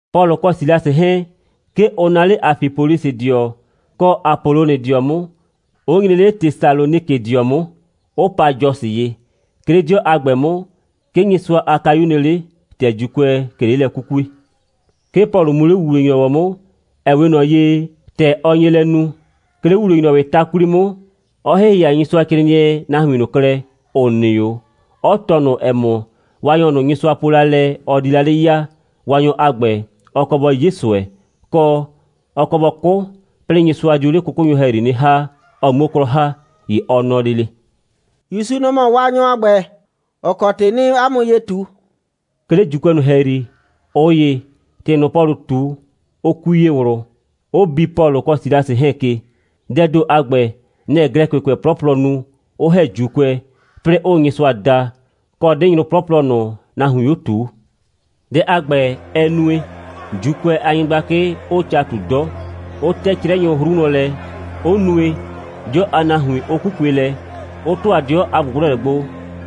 Pɔlʋ kɔ Silasɩ 'hɛɛn, 'ke ʋ naa 'le Afipolisɩdɩɔ kɔ Apolonidɩɔ 'mʋ, 'ʋ nyre 'le Tesalonikɩdɩɔ 'mʋ, ('ʋ pa Jasɔ ye). 'Ke 'le 'dɩɔ a ‑gbɛ 'mʋ, 'ke Nyɩsʋa a kayu nɩ 'le, ‑tɛ ‑Juukʋɛɛ ꞊ke 'le lɛ 'kukue. 'Ke Pɔlʋ mu 'le ‑wuwle‑nyrɔwɔ 'mʋ, ‑ɛ 'we ꞊nɔ ye, ‑tɛ ɔ nye lɛ nu. 'Ke 'le ‑wuwle‑nyrɔwɩɩ ta 'kwli 'mʋ, 'ɔ ‑hɩhɩa Nyɩsʋacrɩɩnɩɛ nahuin ꞊nʋ klɛ, ‑ʋ nɩ 'o, 'ɔ tɔɔ ꞊nʋ, ‑ɛ mɔ, Waanyɔ ꞊nʋ, Nyɩsʋa po la lɛ, ɔ di la 'le ya, Waanyɔ a ‑gbɛ, ɔ kɔ bɔ 'ye ꞊sʋɛ, kɔ, ɔ kɔ bɔ 'kʋ, 'plɩɩ Nyɩsʋa dio 'le 'kʋkʋnyʋ ‑hɛyri 'nɩ ‑ha, ɔ 'muo 'klɔ ‑ha. ‑Ye ɔ nɔ lele: «‑Yusu, nɔ‑ mɔ Waanyɔ a ‑gbɛ, ‑ɔ kɔ ‑tɩ 'nɩɩ 'a mʋ ye ꞊tu.» 'Ke 'le ‑Juukʋɛ ꞊nʋ ‑hɛyri, ꞊ʋ ‑ye, ‑tɩ ꞊nʋ, Pɔlʋ ꞊tu, ʋ kui ye ꞊wlʋ, 'ʋ bi Pɔlʋ kɔ Silasɩ 'hɛɛn ke. Dɛɛ ‑do a ‑gbɛ, nɛ‑ Glɛkɩkʋɛ 'plɔplɔ nu, ‑ʋ ‑hɛ ‑Juukʋɛ, 'plɩɩ ‑ʋʋ Nyɩsʋa da, kɔ 'dɩnyrʋ 'plɔplɔ ꞊nʋ, nahuiin 'o ꞊tuu. Dɛ a ‑gbɛ, ɛ nue, ‑Juukʋɛ a nyɩgblakɩ 'ʋʋ ca ꞊tu 'dɔ, 'ʋ 'tɛ 'crɛnyʋ 'hru wlɔn lɛ, 'ʋ nue, 'dɩɔ a nahuin 'ʋ 'kukue lɛ, 'ʋ ‑tʋa 'dɩɔ a ꞊gblʋgblɔlɛ gbo,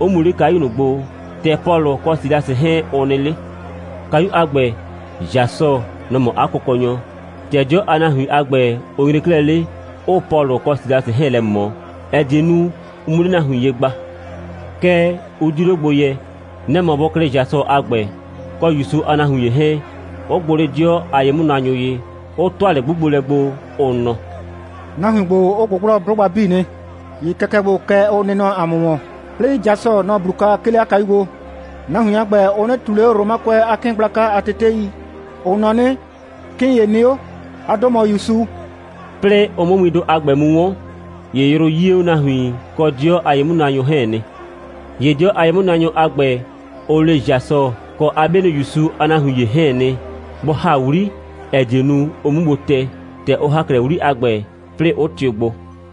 'ʋ mu 'le kayu ꞊nʋ gbo, ‑tɛ Pɔlʋ kɔ Silasɩ 'hɛɛn, ʋ nɩ 'le. Kayu a ‑gbɛ, Jasɔ, nɔ‑ mɔ 'a kʋkɔnyɔ. ‑Tɛ 'dɩɔ a nahuin a ‑gbɛ, ʋ nyre 'klɛɛ 'le, 'ʋʋ Pɔlʋ kɔ Silasɩ 'hɛɛn lɛ ꞊mɔ, ‑ɛ die nu, ʋ 'mu 'le nahuin ye gba. Kɛɛ, ʋ 'diu 'le gbo yɛ. Nɛ‑ mɔ bʋ klɩ Jasɔ a ‑gbɛ, kɔ ‑Yusu a nahuin ‑ye 'hɛɛn, 'ʋ gbʋ 'le 'dɩɔ a ye'mʋnaanyʋ ye, 'ʋ ‑tʋa lɛ'gbugbolɛ gbo, ʋ nɔ: «Nahuin ‑gbo, ʋ ꞊gbʋgblɔ 'blʋgba 'bii nɩ. ‑Ye kɛkɛ ‑gbo, kɛ ʋ nɩ nɔ ‑a mʋ ‑wɔn, 'plɩɩ Jasɔ, nɔ‑ 'blu kwa, 'ke 'le 'a kayu gbo. Nahuin a ‑gbɛ, ʋ 'nɩ ꞊tuu ꞊le 'o Romakʋɛ a 'kɩɩn gblaka a tetei. Ʋ nɔ 'nɩ, 'kɩɩn ‑ye nɩ 'o. 'A 'dʋ mɔ ‑Yusu.» 'Plɩɩ ʋ 'mʋ windʋ a ‑gbɛ mu 'wɔn, ‑ye yrʋ 'yie 'o nahuin kɔ 'dɩɔ a ye'mʋnaanyʋ 'hɛɛn nɩ. ‑Ye 'dɩɔ a ye'mʋnaanyʋ a ‑gbɛ, ʋ le Jasɔ kɔ 'a 'bienʋ ‑Yusu a nahuin ‑ye 'hɛɛn nɩ, bʋ ‑ha 'wli, ‑ɛ die nu, ʋ 'mu gbo tɛ. ‑Tɛ ʋ ‑ha 'klɛɛ 'wli a ‑gbɛ, 'plɩɩ 'ʋ tɩʋ gbo.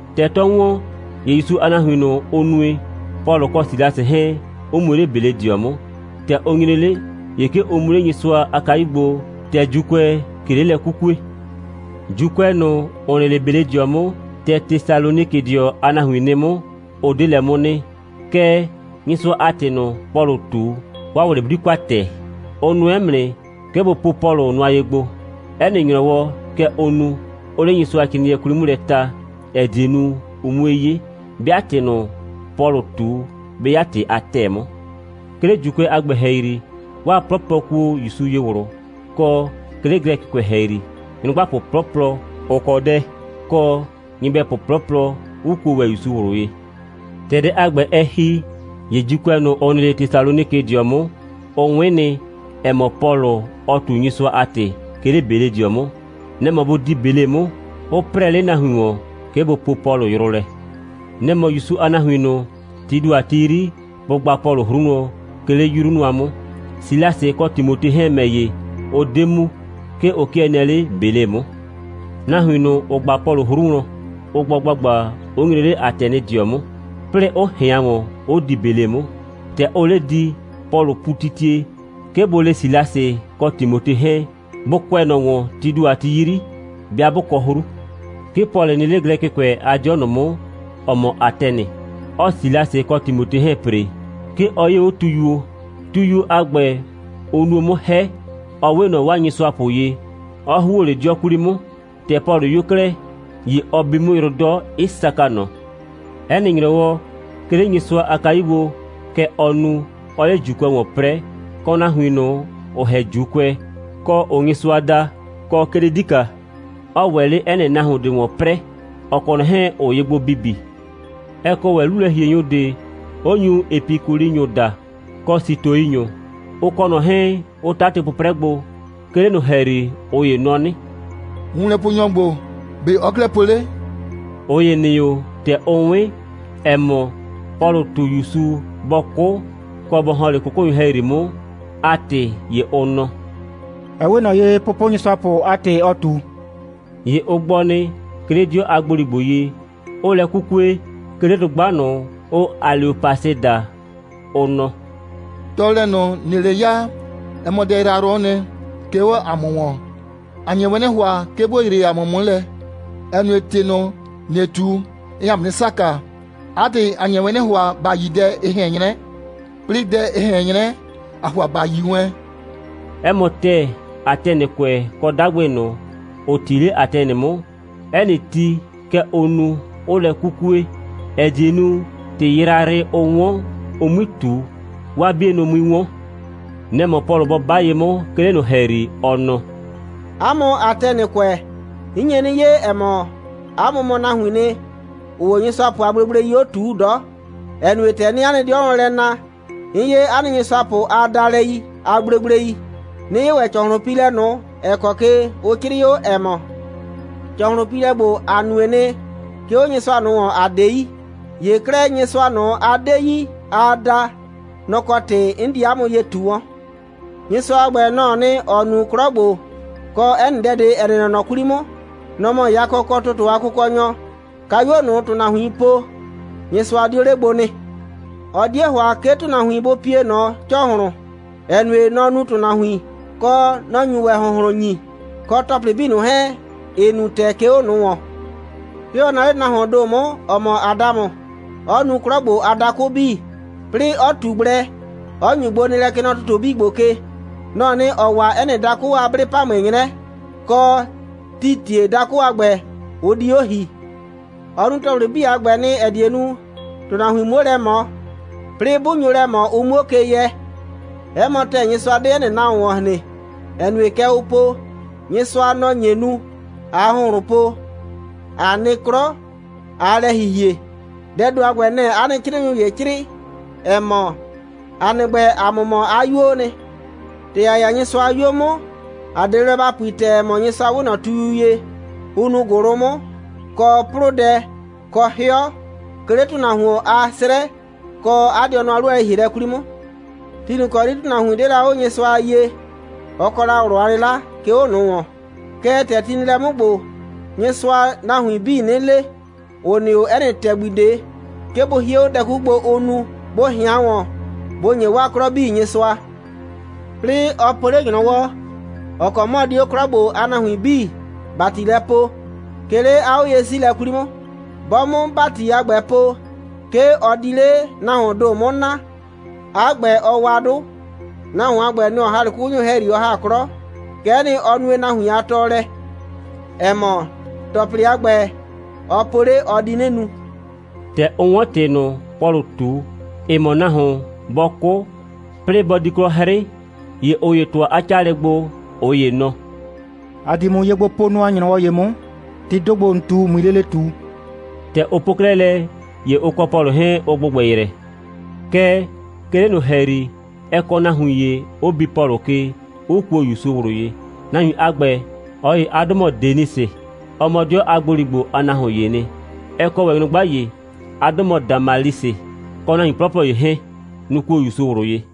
‑Tɛ 'tɔ ‑wɔn, ‑ye ‑Yusu a nahuin ꞊nʋ, ʋ nue, Pɔlʋ kɔ Silasɩ 'hɛɛn, 'ʋ mu 'le Beledɩɔ 'mʋ. ‑Tɛ ʋ nyre 'le, ‑ye 'ke ʋ mu 'le Nyɩsʋa a kayu gbo, ‑tɛ ‑Juukʋɛɛ ꞊ke 'le lɛ 'kukue. ‑Juukʋɛ ꞊nʋ, ‑ʋ nɩ 'le Beledɩɔ 'mʋ, ‑tɛ Tesalonikɩdɩɔ a nahuin nɩ 'mʋ, ʋ 'de lɛ 'mʋ nɩ. Kɛɛ, Nyɩsʋa a ‑tɩ ꞊nʋ, Pɔlʋʋ ꞊tu, 'waa ꞊wlɩ 'bli kwa ‑tɛɛ. Ʋ nʋɛ 'mʋ nɩ, 'ke bʋ po Pɔlʋ nʋ nʋa ye gbo. 'Ɛ nɩ ‑nyrɔwɔ, kɛ ʋʋ nu, 'ʋʋ 'le Nyɩsʋacrɩɩnɩɛ 'kwli 'mʋ lɛ ta, ‑ɛ die nu, ʋ 'mue 'ye, 'bɩa ‑tɩ ꞊nʋ, Pɔlʋ ꞊tu, 'bɩ 'ya ‑tɩ a ‑tɛɛ 'mʋ. 'Ke 'le ‑Juukʋɛ a ‑gbɛ ‑hɛyri, 'waa 'plɔplɔ kuo ‑Yusu ye ꞊wlʋ, kɔ, 'ke 'le Glɛkɩkʋɛ ‑hɛyri, nyrʋgbapʋ 'plɔplɔ, ‑ʋ kɔ dɛ, kɔ, nyɩbɛpʋ 'plɔplɔ, 'ʋ kuo ‑wɛ ‑Yusu ꞊wlʋ ye. ‑Tɛ dɛ a ‑gbɛ, ɛ ‑hi, ‑ye ‑Juukʋɛ ꞊nʋ, ‑ʋ nɩ 'le Tesalonikɩdɩɔ 'mʋ, ʋ 'wɩn nɩ, ‑ɛ mɔ, Pɔlʋ, ɔɔ ꞊tu Nyɩsʋa a ‑tɩ, 'ke 'le Beledɩɔ 'mʋ. Nɛ‑ mɔ bʋ di Bele 'mʋ, 'ʋ 'prɛɛ 'le nahuin ‑wɔn, 'ke bʋ poo Pɔlʋ yrʋ lɛ. Nɛ‑ mɔ ‑Yusu a nahuin ꞊nʋ, tii ‑do a ti 'yri, bʋ gba Pɔlʋ 'hru wlɔn, 'ke 'le 'yru nʋa 'mʋ. Silasɩ kɔ Timote 'hɛɛn ‑mɛ ‑ye, ʋ 'de mu. 'Ke ʋ 'kɩɛ nɩɛ 'le Bele 'mʋ. Nahuin ꞊nʋ, ‑ʋ gba Pɔlʋ 'hru wlɔn, ʋ gbɔ ‑gbagba, 'ʋ nyre 'le Atɛnɩdɩɔ 'mʋ, 'plɩɩ 'ʋ ꞊hɩan ‑wɔn, 'ʋ di Bele 'mʋ. ‑Tɛ ʋʋ 'le di, Pɔlʋ pu titie, 'ke bʋ le Silasɩ kɔ Timote 'hɛɛn, bʋ kʋɛ ꞊nɔ ‑wɔn, tii ‑do a ti 'yri, 'bɩa 'bʋ kɔ 'hru. 'Ke Pɔlʋ nɩ 'le Glɛkɩkʋɛ a 'dɩɔ ꞊nʋ 'mʋ, ‑ɔ mɔ Atɛnɩ, 'ɔɔ Silasɩ kɔ Timote 'hɛɛn ‑pre. 'Ke ɔ 'yee 'o tuyuo. Tuyuo a ‑gbɛ, ʋ nuo 'mʋ 'hɛ, 'ɔ 'we ꞊nɔ 'waa nyɩsʋapʋ ye, 'ɔ ‑huo 'le 'dɩɔ 'kwli 'mʋ. ‑Tɛ Pɔlʋ 'yo 'klɛɛ, ‑ye ɔ bi 'mʋ yrʋ 'dɔ, 'ɩ saka ꞊nɔ. 'Ɛ nɩ ‑nyrɔwɔ, 'ke 'le Nyɩsʋa a kayu gbo, kɛ ɔɔ nu, 'ɔɔ 'le ‑Juukʋɛ ‑wɔn 'prɛɛ, kɔ nahuin ꞊nʋ, ‑ʋ ‑hɛ ‑Juukʋɛ, kɔ, ‑ʋʋ Nyɩsʋa da, kɔ 'ke 'le 'dika, 'ɔɔ ‑wɛ 'le 'ɛ nɩ nahuon ꞊de ‑wɔn 'prɛɛ, ‑ɔ kɔ ꞊nɔ 'hɛɛn, ‑ʋʋ ye gbo bibi. Ɛ kɔ ‑wɛ 'lulɛ‑hienyʋ ꞊de, 'ʋ nyu Epikulinyʋ daa, kɔ Sitoinyʋ. Ʋ kɔ ꞊nɔ 'hɛɛn, ʋ 'tatɩ 'pʋprɛ gbo. 'Ke 'le ꞊nʋ ‑hɛyri, ꞊ʋ ‑ye nɔ 'nɩ: «Wunlɛponyɔ ‑gbo, ‑be' ɔɔ 'klɛɛ po 'le?» ꞊Ʋ ‑ye nɩ 'o, ‑tɛ ʋ 'wɩn, ‑ɛ mɔ, Pɔlʋʋ ꞊tu ‑Yusu bɔ 'kʋ kɔ bɔ ‑hɔn 'le 'kʋkʋnyʋ ‑hɛyri 'mʋ a ‑tɩ, ‑ye ʋ nɔ: «Ɛ 'we ꞊nɔ ye, pʋpʋnyɩsʋapʋ a ‑tɩ ɔɔ ꞊tu.» ‑Ye ʋ gbɔ nɩ, 'ke 'le 'dɩɔ a ‑gboligbo ye, ‑ʋʋ lɛ 'kukue, 'ke 'le dʋgba ꞊nʋ, ʋʋ Aleopasɩ daa, ʋ nɔ: «Tɔɔlɛ ꞊nʋ, ‑nɩɩ 'le ya, ɛ mɔ dɛ yrayrʋ'ʋ nɩ, 'ke 'o ‑a mʋ ‑wɔn. ‑A nye wɛn 'nɩ ‑hʋa, 'ke ‑bo yree ‑a mʋ 'mʋ lɛ, ‑ɛ nue, ꞊tɩ ꞊nʋ, ‑nɩɩ ꞊tu, ɩɩ ‑a mʋ 'nɩ saka. 'A ‑tɩ, ‑a nye 'nɩ ‑hʋa, ‑ba yi dɛ, ɩ ꞊hɛn 'nyrɛ, 'plɩɩ, dɛ, ɩ ꞊hɛn 'nyrɛ, ‑aa ‑hʋa ‑ba yi wɛn.» 'Ɛ mɔ ‑tɛɛ, Atɛnɩkʋɛ kɔ 'dagbɩ ꞊nʋ, ‑ʋ 'ti 'le Atɛnɩ 'mʋ, 'ɛ nɩ ti, kɛ ʋʋ nu, 'ʋʋ lɛ 'kukue, ‑ɛ die nu, ‑tɩ yrayrɩ, ʋ 'wɔn, ʋ 'mui ꞊tu, 'waa 'bienʋ 'mui 'wɔn. Nɛ‑ mɔ Pɔlʋ bɔ 'ba ye 'mʋ, 'ke 'le ꞊nʋ ‑hɛyri, ɔ nɔ: «'A mʋ Atɛnɩkʋɛ, 'n nye 'nɩ 'ye, ‑ɛ mɔ, 'a mʋ mɔ nahuiin nɩ, ‑ʋʋ 'o nyɩsʋapʋ a gblegblei 'o ꞊tuu 'dɔ, ‑ɛ nue, ‑tɛ 'nɩɩ 'a nɩ 'dɩɔ wlɔn lɛ na, 'n 'ye 'a nɩ nyɩsʋapʋ a daalɛi a gblegblei, 'nɩ 'ye ‑wɛ ‑cɔhlʋnpiilɛ ꞊nʋ, ‑ɛ kɔ ye ʋ 'crɩɩ 'o, ‑ɛ mɔ: ‑Cɔhlʋnpiilɛ ‑gbo, ‑a nue nɩ, 'ke 'o nyɩsʋa ꞊nʋ ‑wɔn, ‑a 'de yi. ‑Ye 'klɛɛ, Nyɩsʋa ꞊nʋ, a 'de yi, aa da, nɔ‑ kɔ ‑tɩ 'n di 'a mʋ ye ꞊tu wɔn. Nyɩsʋa a ‑gbɛ, nɔ‑ɔ nɩ, ‑ɔ nu 'klɔ ‑gbo, kɔ 'ɛ nɩ dɛ, ‑ɛ nɩ nɔ ꞊nɔ 'kwli 'mʋ. Nɔ‑ mɔ yakɔ kɔ ‑tʋtʋ a Kʋkɔnyɔ. Kayuo ꞊nʋ, ‑tʋnahuin po, Nyɩsʋa 'dio 'le gbo nɩ. Ɔ 'die ‑hʋa, 'ke ‑tʋnahuin bʋ pie ꞊nɔ ‑cɔhlʋn, ‑ɛ nue, nɔ‑ nu ‑tʋnahuin, kɔ, nɔ‑ nyu ‑wɛ ‑hʋnhlʋn ‑nyi, kɔ ‑tɔplɩ 'bii ꞊nʋ 'hɛɛn, ‑ɩ nu ‑tɛɛ, 'ke 'o ꞊nʋ ‑wɔn. 'Ke ɔ naa 'le nahuoon ‑do 'mʋ, ‑ɔ mɔ Adamʋ, 'ɔ nu 'klɔ ‑gbo a dakʋ 'bii, 'plɩɩ 'ɔ ꞊tu gblɛ, 'ɔ ‑nyu gbonɩɩlɛ, kɛ nɔ ‑tʋtʋ 'bii ‑gbo ke. Nɔ‑ɔ nɩ, ‑ɔ wa 'ɛ nɩ dakʋ a 'blɩ‑pamʋɩ 'nyrɛ, kɔ, tii ‑tie dakʋ a ‑gbɛ, ʋ di 'o ‑hi. Ɔ nu ‑tɔplɩ 'bii a ‑gbɛ nɩ, ‑ɛ die nu, ‑tʋnahuin 'muo lɛ ꞊mɔ, 'plɩɩ 'bʋ nyo lɛ ꞊mɔ, ʋ 'muo ke yɛ. 'Ɛ mɔ ‑tɛɛ, Nyɩsʋa 'de 'ɛ nɩ nahuon ‑wɔn hren, ‑ɛ nue, kɛ ʋ po: Nyɩsʋa, nɔ‑ nye nu, ꞊aa ‑hʋnhlʋn po, ꞊a nɩ 'klɔ, ꞊aa lɛ ‑hihie. Dɛɛ ‑do a ‑gbɛ, nɛ‑ 'a nɩ 'crɩɩnyʋ ‑ye 'crɩɩ, ‑ɛ mɔ: ‑A nɩ ‑gbɛ, ‑a mʋ mɔ 'a 'yuoo nɩ. ‑Tɛ ‑a 'ya Nyɩsʋa a 'yuo 'mʋ, ‑a 'de ye blɛ ‑ba pui ‑tɛɛ, ‑ɛ mɔ, Nyɩsʋa 'we ꞊nɔ tuyu ye, ʋ nuu ‑gʋlʋ 'mʋ, kɔ 'plʋdɛ, kɔ 'hɩɔ, 'ke 'le ‑tʋnahuon a 'srɛ, kɔ 'a dɩɔnʋ a 'lu a lɛ‑hielɛ 'kwli 'mʋ. Ti ꞊nʋ ‑kɔ 'yri ‑tʋnahuin 'de la 'o Nyɩsʋa a yie, ɔ kɔ la ꞊wlʋ a 'lɩla, 'ke 'o ꞊nʋ ‑wɔn. Kɛɛ, ‑tɛ ti nɩ lɛ 'mʋ ‑gbo, Nyɩsʋaa nahuin 'bii 'nɩ le, ‑ʋ nɩ 'o 'ɛ nɩ ‑tɛgbi ꞊de, 'ke bʋ hie 'o dɛ 'kuku gbo, ʋʋ nu, bʋ ꞊hɩan ‑wɔn, bʋ ‑nye 'waa 'klɔ 'bii Nyɩsʋa. 'Plɩɩ, ɔ po 'le ‑nyrɔwɔ, ‑ɔ kɔ 'mʋ ɔ di 'o 'klɔ 'bii ‑gbo a nahuin ‑bati lɛ poo, 'ke 'le 'a 'oye'siilɛ 'kwli 'mʋ. 'Bɔ 'mʋ ‑bati a ‑gbɛ po, 'ke ɔ di 'le nahuoon ‑do ꞊nʋ 'mʋ naa, 'a ‑gbɛ, ɔ wa 'dʋ. Nahuon a ‑gbɛ, nɔ‑ ɔ ‑ha 'le 'kʋkʋnyʋ ‑hɛyri, ɔ ‑ha 'klɔ. Kɛ'ɛ nɩ, ɔ nue nahuin a tɔɔlɛ, ‑ɛ mɔ, ‑tɔplɩ a ‑gbɛ, ɔ po 'le, ɔ di 'nɩ nu.» ‑Tɛ ʋ 'wɔn ‑tɩ ꞊nʋ, Pɔlʋ ꞊tu, ‑ɩ mɔ nahuon, bɔ 'kʋ, 'plɩɩ bɔ di 'klɔ 'hrɩ, ‑ye ꞊ʋ ‑ye ‑tʋa 'a 'caalɛ gbo, ꞊ʋ ‑ye nɔ: «‑A di ‑mʋ ye gbo po nʋa ‑nyrɔwɔ ‑ye 'mʋ, ‑tɩɩ ‑do ‑gbo, ‑n ꞊tu, ꞊mui lele ꞊tu.» ‑Tɛ ʋ po 'klɛɛ lɛ, ‑ye ʋ kɔ Pɔlʋ 'hɛɛn, ʋ ‑gbʋgbɛ yrɛ. Kɛɛ, 'ke 'le ꞊nʋ ‑hɛyri, ɛ kɔ nahuin ‑ye, 'ʋ bi Pɔlʋ ke, 'ʋ kuo ‑Yusu ꞊wlʋ ye. Nahuin a ‑gbɛ, ꞊ɔ ‑ye a 'dʋ mɔ Denisɩ. Ɔ mɔ 'dɩɔ a ‑gboligbo a nahuon ‑yee nɩ. Ɛ kɔ ‑wɛ nyrʋgba ‑ye. 'A 'dʋ mɔ Damalisɩ, kɔ nahuin 'plɔplɔ ‑ye 'hɛɛn. Nʋ‑ kuo ‑Yusu ꞊wlʋ ye.